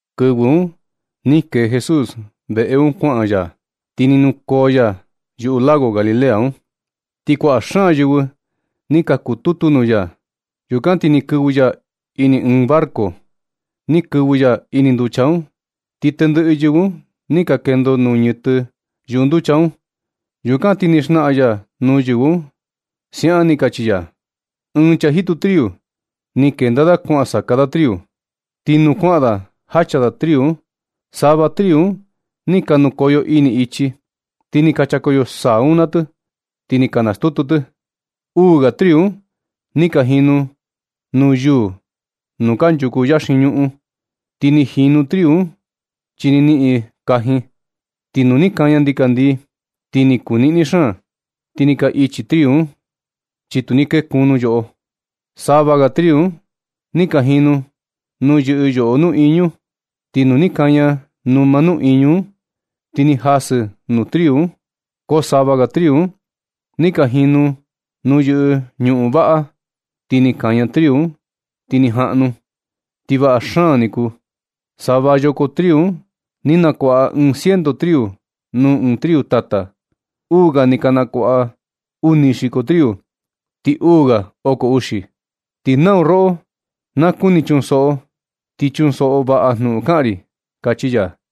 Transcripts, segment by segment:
Kɨvɨ un ni kee Jesús veꞌe un kuaꞌan ya, ti ni nukoo ya yuꞌu lago Galilea un. Ti kuaꞌa xaan yɨvɨ ni ka kututu nuu ya. Yukan ti ni kɨvɨ ya ini ɨɨn barco, ni kɨvɨ ya ini nducha un, ti tendɨꞌɨ yɨvɨ un ni ka kendo nuu ñɨtɨ yuꞌu nducha un. Yukan ti ni xnaꞌan ya nuu yɨvɨ un siaꞌan, ni kachi ya: ―Ɨɨn chaa jitu triu ni kenda da kuan saka da triu. Ti nuu kuaꞌan da jacha da triu un sava triu un ni ka nukoyo ini ichi, ti ni ka chakoyo saa un naa tɨ, ti ni ka nastutu tɨ. Uu ga triu un ni ka jinu nuu yuu nuu kanchuku yaxin ñuꞌun, ti ni jinu triu un, chi ni niꞌin kajin. Ti nu ni kaña ndikandii, ti ni kuu niꞌni xaan, ti ni ka ichi triu un, chi tu ni niꞌin yoꞌo. Sava ga triu un ni ka jinu nuu yɨꞌɨ yoꞌo nuꞌiñu. Ti nu ni kaña numa nuꞌiñu un, ti ni ka jasɨ nuu triu un. Ko sava ga triu un ni ka jinu i nuu yɨꞌɨ ñuꞌun vaꞌa, ti ni kaña triu un ti ni jaꞌnu, ti vaꞌa xaan ni kuu. Sava yoko triu un ni nakuaꞌa ɨɨn ciento triu nuu ɨɨn triu tata. Uu ga ni ka nakuaꞌa uni xiko triu, ti uu ga oko uxi. Ti nau roꞌo na kuni chunsoꞌo, ti chunsoꞌo vaꞌa jnuꞌun kaꞌan ri ―kachi ya.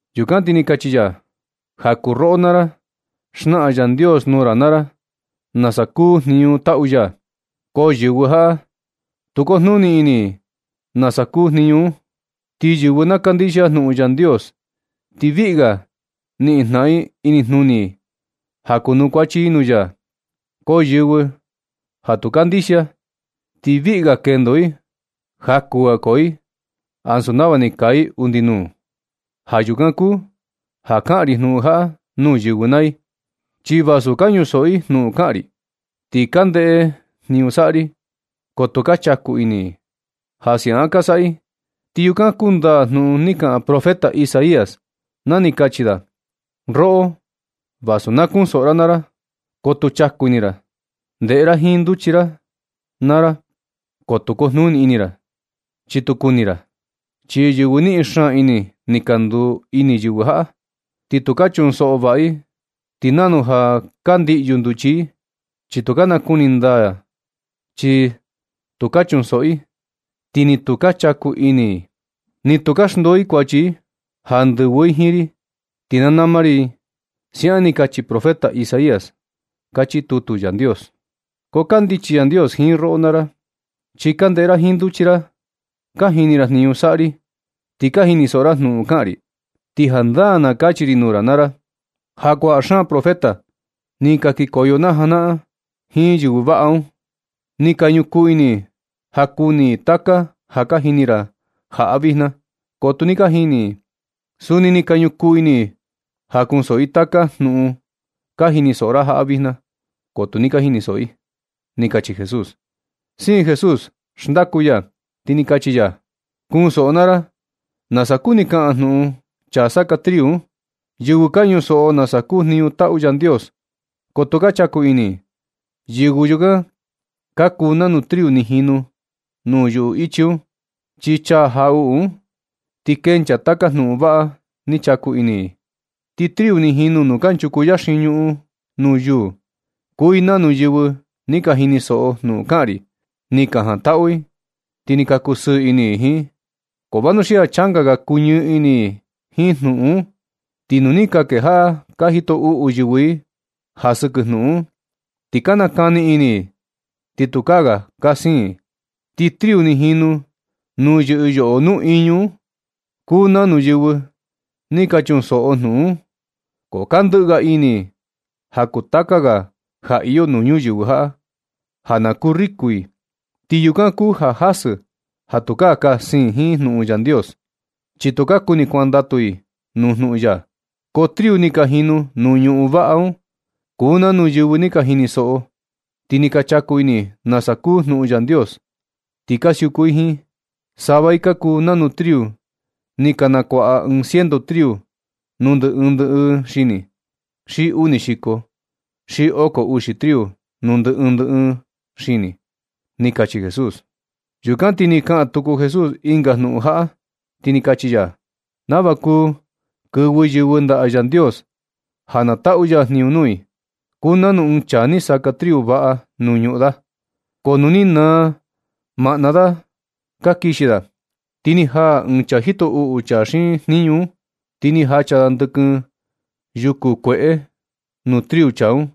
Yukan ti ni kachi ya: ―Ja kuu roꞌo naa ra, xnaꞌan Yandios nuu ra naa ra nasa kuu jniñu taꞌu ya, ko yɨvɨ jaꞌa tu kujnuni ini i nasa kuu jniñu un. Ti yɨvɨ na kandixia jnuꞌun Yandios, ti viꞌi ga niꞌin jnaꞌan i inijnuni i ja kunukuachi i nuu ya. Ko yɨvɨ ja tu kandixia, ti viꞌi ga kendo i, jaku ga koo i, ansu nava ni kaa i undi nuu. Ja yukan kuu ja kaꞌan ri jnuꞌun jaꞌa nuu yɨvɨ naa i, chi vasu ka ñusoꞌo i jnuꞌun kaꞌan ri, ti ka ndeꞌe jniñu saꞌa ri, ko tu ka chaku ini i. Ja siaꞌan ka saꞌa i, ti yukan kundaa jnuꞌun ni kaꞌan profeta Isaías na ni kachi da: Roꞌo, vasu na kunsoꞌo ra naa ra, ko tu chaku ini ra. Ndeꞌe ra jiin nduchi ra naa ra ko tu kojnuni ini ra, chi tu kuni ra. Chi yɨvɨ niꞌin xaan ini ni ka nduu ini yɨvɨ jaꞌa, ti tu ka chunsoꞌo vaꞌa i. Ti nanu ja ka ndiꞌyu nduchi i, chi tu ka nakuni i jandaa. Chi ni tu ka chunsoꞌo i, ti ni tu ka chaku ini i. Ni tu ka xndoo i kuachi i ja ndɨvɨ i jiin ri, ti na nama ri i. Siaꞌan ni kachi profeta Isaías, kachi tutu Yandios. Ko kandichi Yandios jiin roꞌo naa ra, chi ka ndeꞌe ra jiin nduchi ra, ka jini ra jniñu saꞌa ri, ti ka jinisoꞌo ra jnuꞌun kaꞌan ri. Ti jandaa na kachi ri nuu ra naa ra ja kuaꞌa xaan profeta ni ka kikoyo na janaꞌan, jiin yɨvɨ vaꞌa un, ni ka ñukuu ini i ja kuni i taka ja ka jini ra jaꞌa vijna, ko tu ni ka jini i. Suni ni ka ñukuu ini i ja kunsoꞌo i taka jnuꞌun ka jinisoꞌo ra jaꞌa vijna, ko tu ni ka jinisoꞌo i ―ni kachi Jesús. Siin Jesús xndaku ya, ti ni kachi ya: ―Kunsoꞌo naa ra nasa kuni kaꞌan jnuꞌun chaa saka triu un. Yɨvɨ ka ñunsoꞌo nasa kuu jniñu taꞌu Yandios ko tu ka chaku ini i, yɨvɨ yukan ka kuu nanu triu ni jinu nuu yuꞌu ichi un. Chi chaa jaꞌuꞌu un ti kencha taka jnuꞌun vaꞌa ni chaku ini i. Ti triu ni jinu nuu kanchuku yaxin ñuꞌun nuu yuu, kuu i nanu yɨvɨ ni ka jinisoꞌo jnuꞌun kaꞌan ri, ni ka jantaꞌu i, ti ka kusɨɨ ini i jiin. Ko vanuxia changa ga kuñɨɨ ini i jiin jnuꞌun un, ti nu ni ka kejaꞌa ka jito uꞌu yɨvɨ i ja sɨkɨ jnuꞌun un, ti ka nakani ini i ti tukaa ga ka siin i. Ti triu ni ka jinu nuu yɨꞌɨ yoꞌo nuꞌiñu un, kuu nanu yɨvɨ ni ka chunsoꞌo jnuꞌun un, ko ka ndɨꞌɨ ga ini i ja kuu taka ga ja iyo nuu ñuyɨvɨ jaꞌa, ja na kuu riku i. Ti yukan kuu ja jasɨ ja tu ka siin jiin jnuꞌun Yandios, chi tu ka kuni kuandatu i nuu jnuꞌun ya. Ko triu ni ka jinu nuu ñuꞌun vaꞌa un kuu nanu yɨvɨ ni ka jinisoꞌo, ti ni ka chaku ini i nasa kuu jnuꞌun Yandios, ti ka siuku i jiin. Sava i ka kuu nanu triu ni ka nakuaꞌa ɨɨn ciento triu nuu ndɨ ɨɨn ndɨ ɨɨn xini, xi uni xiko, xi oko uxi triu nuu ndɨ ɨɨn ndɨ ɨɨn xini ―ni kachi Jesús. Yukan ti ni kaꞌan tuku Jesús ɨnga jnuꞌun jaꞌa, ti ni kachi ya: ―Nava kuu kɨvɨ yɨvɨ ndaꞌa Yandios ja na taꞌu ya jniñu nuu i, kuu nanu ɨɨn chaa ni saka triu vaꞌa nuu ñuꞌun da. Ko nuu ni naa maꞌna da ka kixi da, ti ni jaa ɨɨn chaa jito uꞌu chaa xiin jniñu un, ti ni jacha da ndɨkɨn yuku kueꞌe nuu triu chaa un,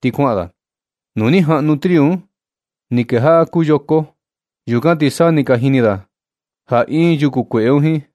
ti kuaꞌan da. Nu ni jaꞌnu triu un, ni kejaꞌa kuu yoko. Yukan ti sa ni ka jini da ja iin yuku kueꞌe un jiin.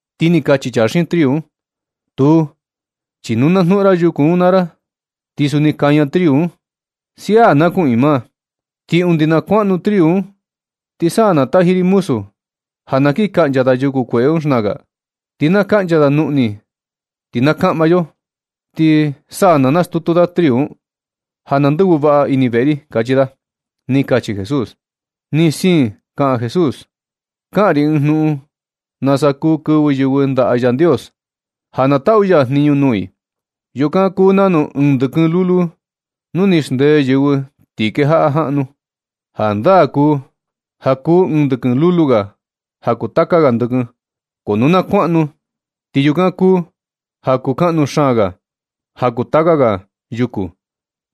Ti ni kachi chaa xiin triu un: “Tuu, chi nu na jnuꞌun ra yuku un naa ra ti suni kaña triu un. Sia, na kuꞌiin maa, ti undi na kuaꞌnu triu un, ti sa na taji ri muzu ja na kiꞌin kaꞌncha da yuku kueꞌe un xnaka. Ti na kaꞌncha da nuꞌni ti na kaꞌma yo, ti sa na nastutu da triu un, ja na ndɨvɨ vaꞌa ini veꞌe ri”, kachi da ―ni kachi Jesús. Ti ni siin kaꞌan Jesús: ―Kaꞌan ri ɨɨn jnuꞌun nasa kuu kɨvɨ yɨvɨ kuaꞌa ndaꞌa Yandios, ja na taꞌu ya jniñu nuu i. Yukan kuu nanu ɨɨn ndɨkɨn lulu nu ni xndee yɨvɨ ti kejaꞌa jaꞌnu. Jandaa kuu ja kuu ɨɨn ndɨkɨn lulu ga ja kuu taka ga ndɨkɨn, ko nu na kuaꞌnu, ti yukan kuu ja kuu kaꞌnu xaan ga ja kuu taka ga yuku.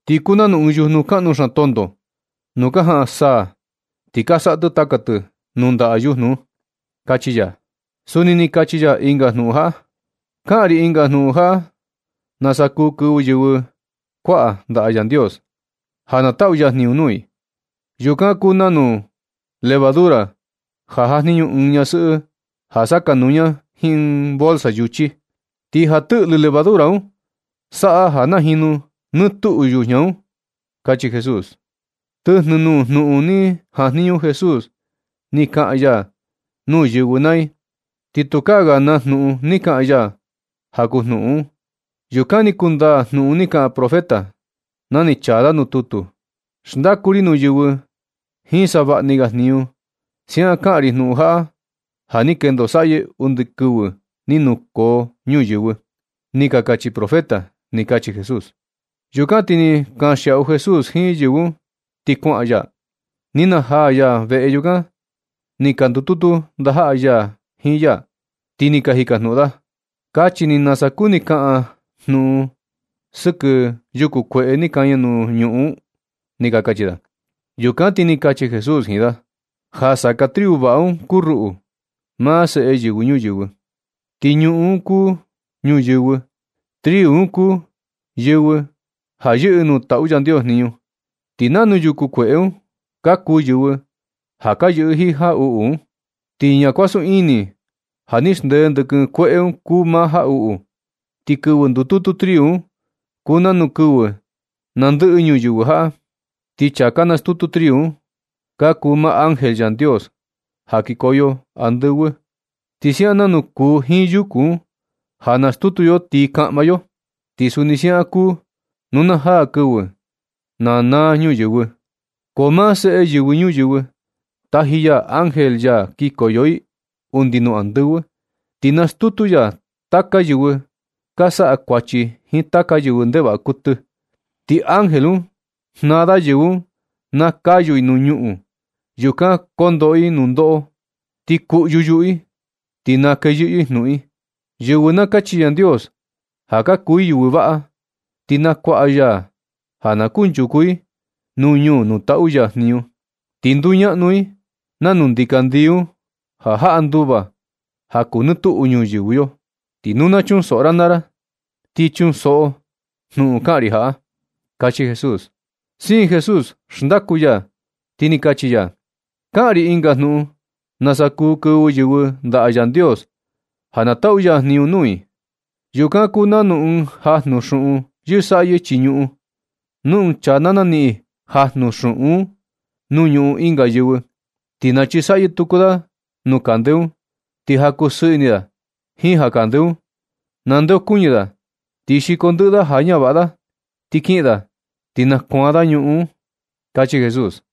Ti kuu nanu ɨɨn yujnu kaꞌnu xaan tonto nu ka jaꞌan saa, ti ka saꞌa tɨ taka tɨ nuu ndaꞌa yujnu un ―kachi ya. Suni ni kachi ya ɨnga jnuꞌun jaꞌa: ―Kaꞌan ri ɨnga jnuꞌun ja nasa kuu kɨvɨ yɨvɨ kuaꞌa ndaꞌa Yandios, ja na taꞌu ya jniñu nuu i. Yukan kuu nanu levadura ja jajniñu ɨɨn ñasɨꞌɨ ja sakanuu ña jiin ɨɨn bolsa yuchi, ti ja tɨꞌlɨ levadura un saꞌa ja najinu nɨ tuꞌu yujña un ―kachi Jesús. Tɨjnɨ nuu jnuꞌun ni jajniñu Jesús ni kaꞌan ya nuu yɨvɨ naa i, ti tukaa ga naa jnuꞌun ni kaꞌan ya ja kuu jnuꞌun un. Yukan ni kundaa jnuꞌun ni kaꞌan profeta na ni chaa da tutu: Xndaku ri nuu yɨvɨ jiin savaꞌni ga jniñu. Siaꞌan kaꞌan ri jnuꞌun jaꞌa ja ni kendo saꞌyɨ undi kɨvɨ ni nukoo ñuyɨvɨ. Ni ka kachi profeta ―ni kachi Jesús. Yukan ti ni kanxiaꞌu Jesús jiin yɨvɨ un, ti kuaꞌan ya. Ni najaa ya veꞌe. Yukan ni ka ndututu ndajaꞌa ya jiin ya, ti ni ka jikajnuꞌun da: ―Kachi ni nasa kuni kaꞌan jnuꞌun sɨkɨ yuku kueꞌe ni kaña nuu ñuꞌun un ―ni ka kachi da. Yukan ti ni kachi Jesús jiin da: ―Ja saka triu vaꞌa un kuu ruꞌu, maa Seꞌe Yɨvɨ Ñuyɨvɨ, ti ñuꞌun un kuu ñuyɨvɨ. Triu un kuu yɨvɨ ja yɨꞌɨ nuu taꞌu Yandios jniñu. Ti nanu yuku kueꞌe un, ka kuu yɨvɨ ja ka yɨꞌɨ jiin jaꞌuꞌu un. Ti ñakuasun ini ja ni xndee ndɨkɨn kueꞌe un kuu maa jaꞌuꞌu. Ti kɨvɨ ndututu triu un kuu nanu kɨvɨ na ndɨꞌɨ ñuyɨvɨ jaꞌa. Ti chaa ka nastutu triu un ka kuu maa ángel Yandios ja kikoyo andɨvɨ. Ti siaꞌan nanu kuu jiin yuku un ja nastutu yo ti kaꞌma yo. Ti suni siaꞌan kuu nu na jaa kɨvɨ na naa ñuyɨvɨ. Ko maa Seꞌe Yɨvɨ Ñuyɨvɨ, taji ya ángel ya kikoyo i undi nuu andɨvɨ, ti nastutu ya taka yɨvɨ ka saꞌa kuachi jiin taka yɨvɨ ndevaꞌa kuɨtɨ. Ti ángel un jnaa da yɨvɨ un na kayu i nuu ñuꞌun. Yukan kondoꞌo i nundoꞌo, ti kuꞌyu yuꞌu i, ti na kee yɨꞌɨ i jnuꞌun i. Yɨvɨ na kachi Yandios ja ka kuu i yɨvɨ vaꞌa, ti nakuaka ya i ja na kunchuku i ñuu nuu taꞌu ya jniñu, ti nduñaꞌnu i nanu ndikandii un, ja jaꞌa nduva ja kuu nɨ tuꞌu ñuyɨvɨ yo. Ti nu na chunsoꞌo ra naa ra, ti chunsoꞌo jnuꞌun kaꞌan ri jaꞌa ―kachi Jesús. Siin Jesús xndaku ya, ti ni kachi ya: ―Kaꞌan ri ɨnga jnuꞌun nasa kuu kɨvɨ yɨvɨ ndaꞌa Yandios ja na taꞌu ya jniñu nuu i. Yukan kuu nanu ɨɨn jajnu xuꞌun yɨsaꞌyɨ chii ñuꞌun. Nu ɨɨn chaa na naniꞌin jajnu xuꞌun un nuu ñuꞌun ɨnga yɨvɨ, ti nachisaꞌyɨ tuku da nuu kande un. Ti ja kusɨɨ ini da jiin ja kande un, nandeokuñɨ da ti xiko ndɨꞌɨ da ja ñavaꞌa da ti kiꞌin da, ti nakuaan da ñuꞌun un ―kachi Jesús.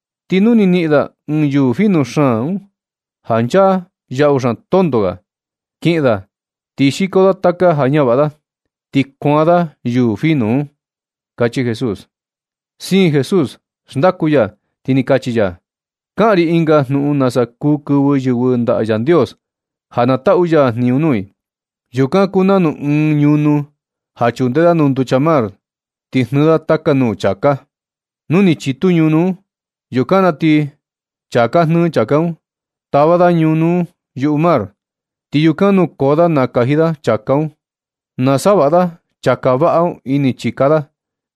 Ti nu ni niꞌin da ɨɨn yuu fino xaan un ja nchaa yaꞌu xaan tonto ga, kiꞌin da ti xiko da taka ja ñavaꞌa da, ti kuaan da yuu fino un―kachi Jesús. Siin Jesús xndaku ya, ti ni kachi ya: ―Kaꞌan ri ɨnga jnuꞌun nasa kuu kɨvɨ yɨvɨ ndaꞌa Yandios ja na taꞌu ya jniñu nuu i. Yukan kuu nanu ɨɨn ñunu ja chunde da nuu nducha mar, ti jnɨɨ da taka nuu chāká. Nu ni chitu ñunu un, yukan na ti chaa ka jnɨɨ chāká un tava da ñunu un yuꞌu mar, ti yukan nukoo da nakaji da chāká un, nasavaꞌa da chāká vaꞌa un ini chika da,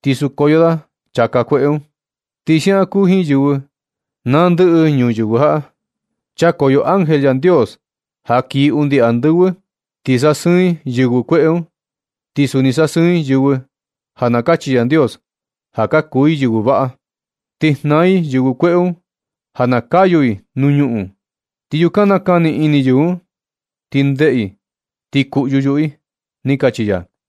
ti sukoyo da chāká kueꞌe un. Ti siaꞌan kuu jiin yɨvɨ na ndɨꞌɨ ñuyɨvɨ jaꞌa. Chakoyo ángel Yandios ja kii undi andɨvɨ, ti sasɨɨn i yɨvɨ kueꞌe un, ti suni sasɨɨn i yɨvɨ ja na kachi Yandios ja ka kuu i yɨvɨ vaꞌa. Ti jnaa i yɨvɨ kueꞌe un ja na kayu i nuu ñuꞌun, ti yukan nakani ini yɨvɨ un ti ndeꞌe, ti kuꞌyu yuꞌu i ―ni kachi ya.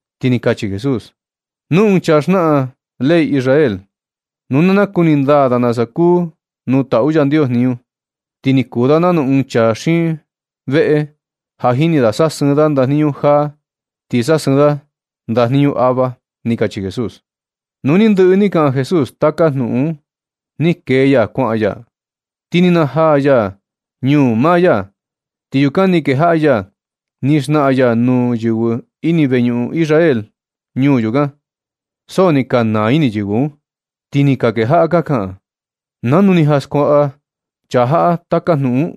Ti ni kachi Jesús: ―Nu ɨɨn chaa xnaꞌan ley Israel, nu na nakuni ndaa da nasa kuu nuu taꞌu Yandios jniñu, ti ni kuu da nanu ɨɨn chaa xiin veꞌe, ja jini da sasɨɨn da ndajniñu jaa, ti sasɨɨn da ndajniñu ava ―ni kachi Jesús. Nu ni ndɨꞌɨ ni kaꞌan Jesús taka jnuꞌun un, ni kee ya kuaꞌan ya. Ti ni najaa ya ñuu maa ya, ti yukan ni kejaꞌa ya ni xnaꞌan ya nuu yɨvɨ ini veñuꞌun Israel ñuu yukan. So ni ka naa ini yɨvɨ un, ti ni ka kejaꞌa ka kaꞌan: ―¿Nanu ni jan skuaꞌa chaa jaꞌa taka jnuꞌun un?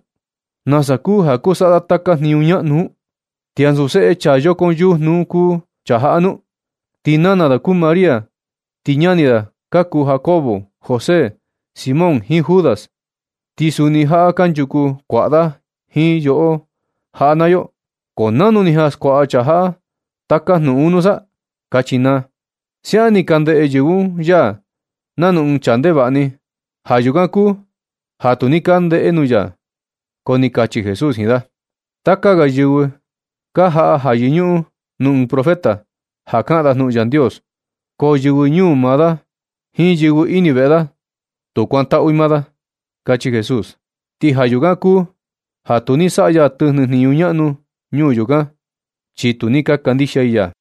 ¿Nasa kuu ja kuu saꞌa da taka jniñu ñaꞌnu un? ¿Ti ansu seꞌe chaa yokon yujnu un kuu chaa jaꞌa nu? Ti nana da kuu María. Ti ñani da ka kuu Jacobo, José, Simón jiin Judas. Ti suni jaꞌa kanchuku kuaꞌa da jiin yo jaꞌa naa yo. ¿Ko nanu ni jan skuaꞌa chaa jaꞌa taka jnuꞌun un nusa? ―kachi naa. Siaꞌan ni ka ndeꞌe yɨvɨ un ya nanu ɨɨn chaa ndevaꞌa ni. Ja yukan kuu ja tu ni ka ndee nuu ya. Ko ni kachi Jesús jiin da: ―Taka ga yɨvɨ ka jaꞌa ja yɨñuꞌun ɨɨn profeta, ja kaꞌan da jnuꞌun Yandios. Ko yɨvɨ ñuu maa da, jiin yɨvɨ ini veꞌe da, tu kuantaꞌu i maa da ―kachi Jesús. Ti ja yukan kuu ja tu ni saꞌa ya tɨjnɨ jniñu ñaꞌnu ñuu yukan, chi tu ni ka kandixia i ya.